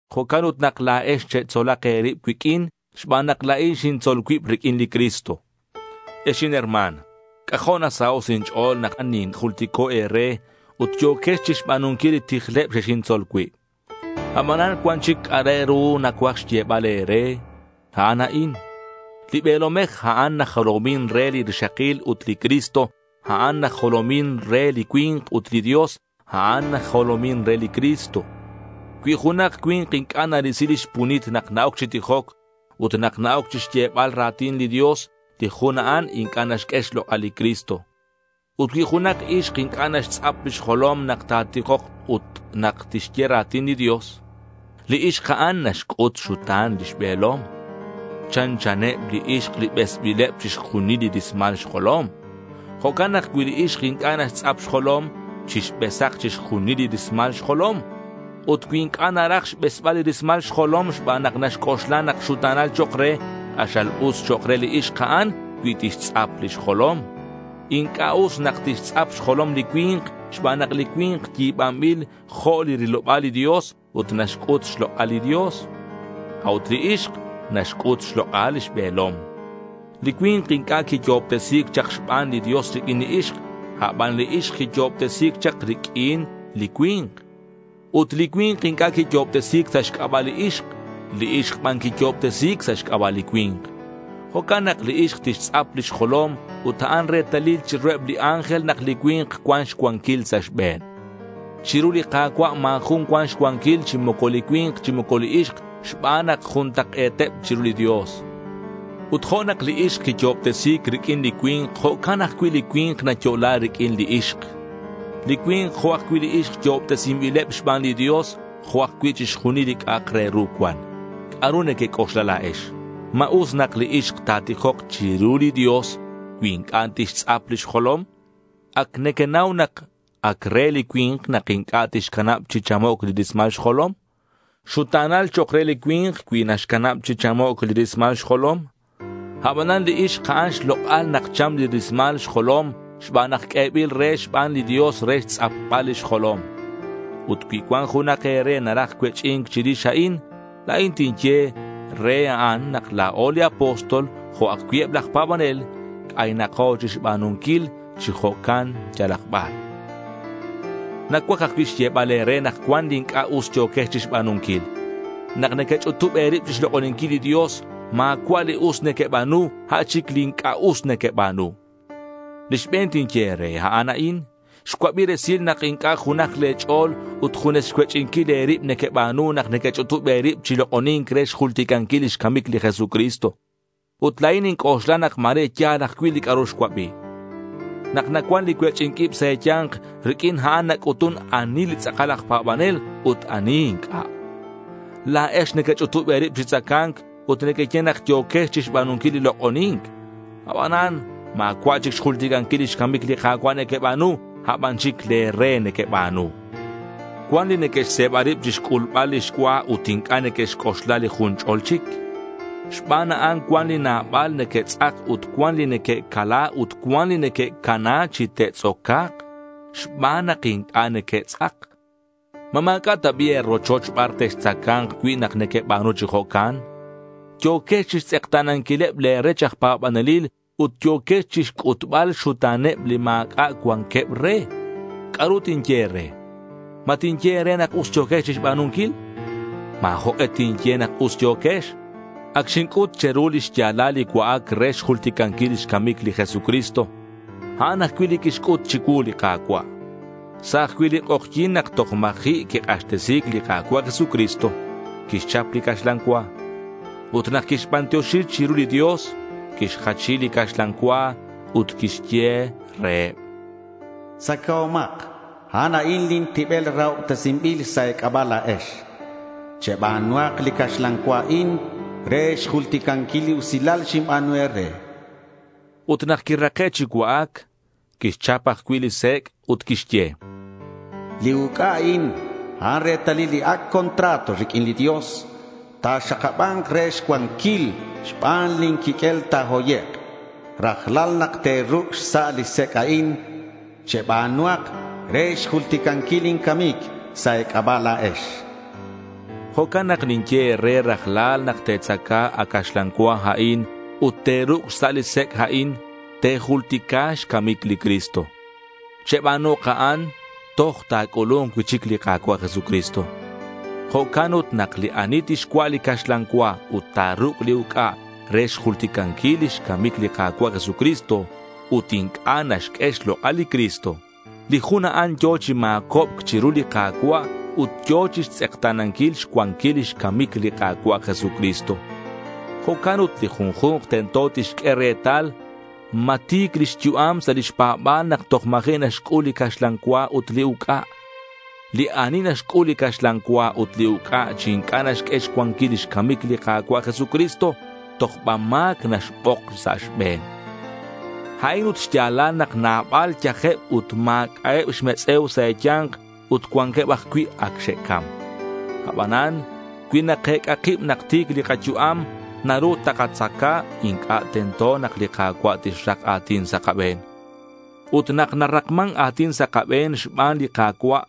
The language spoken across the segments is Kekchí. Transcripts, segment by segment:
Jo'can ut nak la̱ex chetzolak e̱rib cuiq'uin xban nak la̱in xintzol cuib riq'uin li Cristo. Ex inherma̱n, c'ajo' nasaho' sa' inch'o̱l nak ninjultico' e̱re ut yo̱quex chixba̱nunquil li tijleb xexintzol cui'. Abanan cuan chic c'a' re ru nacuaj xyebal e̱re. A'an a'in: li be̱lomej, a'an najolomin re li rixakil ut li Cristo, a'an najolomin re li cui̱nk ut li Dios, a'an najolomin re li Cristo. Cui junak cui̱nk inc'a' narisi lix punit nak na-oc chi tijoc ut nak na-oc chixyebal ra̱tin li Dios, li jun a'an inc'a' naxq'ue xlok'al li Cristo. Ut cui junak ixk inc'a' naxtz'ap lix jolom nak ta̱tijok ut nak tixye ra̱tin li Dios, li ixk a'an naxc'ut xxuta̱n lix be̱lom. Chanchaneb li ixk li besbileb chixjunil li rismal xjolom. Jo'can nak cui li ixk inc'a' naxtz'ap xjolom, chixbesak chixjunil li rismal xjolom. Ut cui inc'a' naraj xbesbal li rismal xjolom xban nak naxc'oxla nak xuta̱nal chok' re, k'axal us chok' re li ixk a'an cui tixtz'ap lix jolom. Inc'a' us nak tixtz'ap xjolom li cui̱nk xban nak li cui̱nk yi̱banbil jo' li riloba̱l li Dios ut naxc'ut xlok'al li Dios. A'ut li ixk naxc'ut xlok'al lix be̱lom. Li cui̱nk inc'a' quiyo'obtesi̱c chak xban li Dios riq'uin li ixk; aban li ixk quiyo'obtesi̱c chak riq'uin li cui̱nk. Ut li cui̱nk inc'a' quiyo'obtesi̱c sa' xc'aba' li ixk. Li ixk ban quiyo'obtesi̱c sa' xc'aba' li cui̱nk. Jo'can nak li ixk tixtz'ap lix jolom ut a'an retalil chiruheb li ángel nak li cui̱nk cuan xcuanquil sa' xbe̱n. Chiru li Ka̱cua' ma̱ jun cuan xcuanquil chi moco li cui̱nk chi moco li ixk xban nak juntak'e̱teb chiru li Dios. Ut jo' nak li ixk quiyo'obtesi̱c riq'uin li cui̱nk, jo'can ajcui' li cui̱nk nayo'la riq'uin li ixk. Li cui̱nk jo' ajcui' li ixk yo'obtesinbileb xban li Dios jo' ajcui' chixjunil li c'a'ak re ru cuan. ¿C'a'ru nequec'oxla la̱ex? ¿Ma us nak li ixk ta̱tijok chiru li Dios cui inc'a' tixtz'ap lix jolom? Ac nequenau nak ac re li cui̱nk nak inc'a' tixcanab chi chamoc' li rismal xjolom. Xuta̱nal chok' re li cui̱nk cui naxcanab chi chamoc' li rismal xjolom. Abanan li ixk a'an xlok'al nak cham li rismal xjolom xban nak q'uebil re xban li Dios re xtz'apbal lix jolom. Ut cui cuan junak e̱re naraj cuech'i̱nc chirix a'in, la̱in tinye re a'an nak la̱o li apóstol jo' ajcui' eb laj pa̱banel c'aynako chixba̱nunquil chi jo'can yalak bar. Nacuaj ajcui' xyebal e̱re nak cuan li inc'a' us yo̱quex chixba̱nunquil. Nak nequech'utub e̱rib chixlok'oninquil li Dios ma̱cua' li us nequeba̱nu. A' chic li inc'a' us nequeba̱nu. Li xbe̱n tinye e̱re, a'an a'in: xcuabi resil nak inc'a' junaj le̱ ch'o̱l ut junes xcuech'inquil e̱rib nequeba̱nu nak nequech'utub e̱rib chi lok'oni̱nc re xjulticanquil lix camic li Jesucristo. Ut la̱in ninc'oxla nak ma̱re ya̱l ajcui' li c'a'ru xcuabi. Nak nacuan li cuech'i̱nc ib sa' e̱ya̱nk, riq'uin a'an nac'utun ani li tz'akal aj pa̱banel ut ani inc'a'. La̱ex nequech'utub e̱rib chi tzaca̱nc ut nequeye nak yo̱quex chixba̱nunquil li lok'oni̱nc. Abanan ma̱cua' chic xjulticanquil lix camic li Ka̱cua' nequeba̱nu. A' ban chic le̱ re nequeba̱nu. Cuan li neque'xse̱ba rib chixc'ulbal lix cua ut inc'a' neque'xc'oxla li jun ch'ol chic. Xban a'an cuan li nabal neque'tz'ak ut cuan li neque'cala ut cuan li neque'cana chi te'tz'oca̱k xban nak inc'a' neque'tz'ak. ¿Ma ma̱c'a' ta bi' e̱rochoch bar textzaca̱nk cui' nak nequeba̱nu chi jo'can? Yo̱quex chixtz'ekta̱nanquileb le̱ rech aj pa̱banelil ut yo̱quex chixc'utbal xxuta̱neb li ma̱c'a' cuanqueb re. ¿C'a'ru tinye e̱re? ¿Ma tinye e̱re nak us yo̱quex chixba̱nunquil? Ma̱ jok'e tinye nak us yo̱quex. Ac xinc'ut che̱ru li xya̱lal li cua'ac re xjulticanquil lix camic li Jesucristo. A'an ajcui' li quixc'ut chicuu li Ka̱cua'. Sa' ajcui' li k'ojyi̱n nak toj ma̱ji' quik'axtesi̱c li Ka̱cua' Jesucristo quixchap li caxlan cua. Ut nak quixbantioxi chiru li Dios, quixjachi li caxlan cua ut quixye reheb: Tzacahomak. A'an a'in lin tibel rahobtesinbil sa' e̱c'aba' la̱ex. Cheba̱nuhak li caxlan cua a'in re xjulticanquil li usilal xinba̱nu e̱re, chan. Ut nak que'rake' chi cua'ac quixchap ajcui' li sec' ut quixye: Li uc'a a'in, a'an retalil li Ac' Contrato riq'uin li Dios. Ta̱xakaba̱nk re xcuanquil xban lin quiq'uel ta̱hoyek'. Rajlal nak te̱ruc' xsa' li sec' a'in, cheba̱nuhak re xjulticanquil lin camic sa' e̱c'aba' la̱ex, chan li Jesús. Jo'can nak ninye e̱re rajlal nak te̱tzaca a caxlan cua a'in ut te̱ruc' xsa' li sec' a'in, te̱jultica xcamic li Cristo. Cheba̱nuhak a'an toj ta̱c'ulu̱nk cui'chic li Ka̱cua' Jesucristo. Jo'can ut li ani tixcua' li caxlan cua ut ta̱ruc' li uc'a re xjulticanquil lix camic li Ka̱cua' Jesucristo ut inc'a' naxq'ue xlok'al li Cristo, li jun a'an yo̱ chi ma̱cobc chiru li Ka̱cua' ut yo̱ chixtz'ekta̱nanquil xcuanquil lix camic li Ka̱cua' Jesucristo. Jo'can ut li junju̱nk tento tixq'ue retal ma ti̱c lix yu'am sa' lix pa̱ba̱l nak toj ma̱ji' naxc'ul li caxlan cua ut li uc'a. Li ani naxc'ul li caxlan cua ut li uc'a chi inc'a' naxq'ue xcuanquil lix camic li Ka̱cua' Jesucristo, tojba ma̱c naxbok sa' xbe̱n. A'in ut xya̱lal nak nabal yajeb ut ma̱c'a'eb xmetz'e̱u sa' e̱ya̱nk ut cuanqueb ajcui' ac xe'cam. Abanan cui nakec'a kib nak ti̱c li kayu'am nak nakatzaca inc'a' tento nak li Ka̱cua' tixrak a̱tin sa' kabe̱n. Ut nak narakman a̱tin sa' kabe̱n xban li Ka̱cua'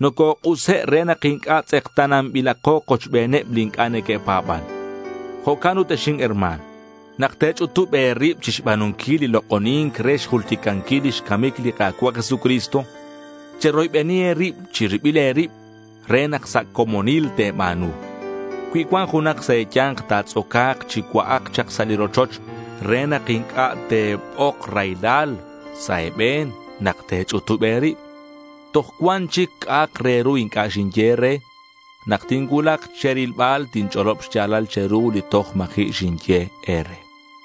nocok'use' re nak inc'a' tz'ekta̱nanbilako kochbeneb li inc'a' neque'pa̱ban. Jo'can ut ex inherma̱n, nak te̱ch'utub e̱rib chixba̱nunquil li lok'oni̱nc re xjulticanquil lix camic li Ka̱cua' Jesucristo, cheroybeni e̱rib chi ribil e̱rib re nak sa' comonil te̱ba̱nu. Cui cuan junak sa' e̱ya̱nk ta̱tz'oca̱k, chicua'ak chak sa' rochoch re nak inc'a' te̱bok raylal sa' e̱be̱n nak te̱ch'utub e̱rib. Toj cuan chic c'a'ak re ru inc'a' xinye e̱re. Nak tincuulak che̱rilbal tinch'olob xya̱lal che̱ru li toj ma̱ji' xinye e̱re.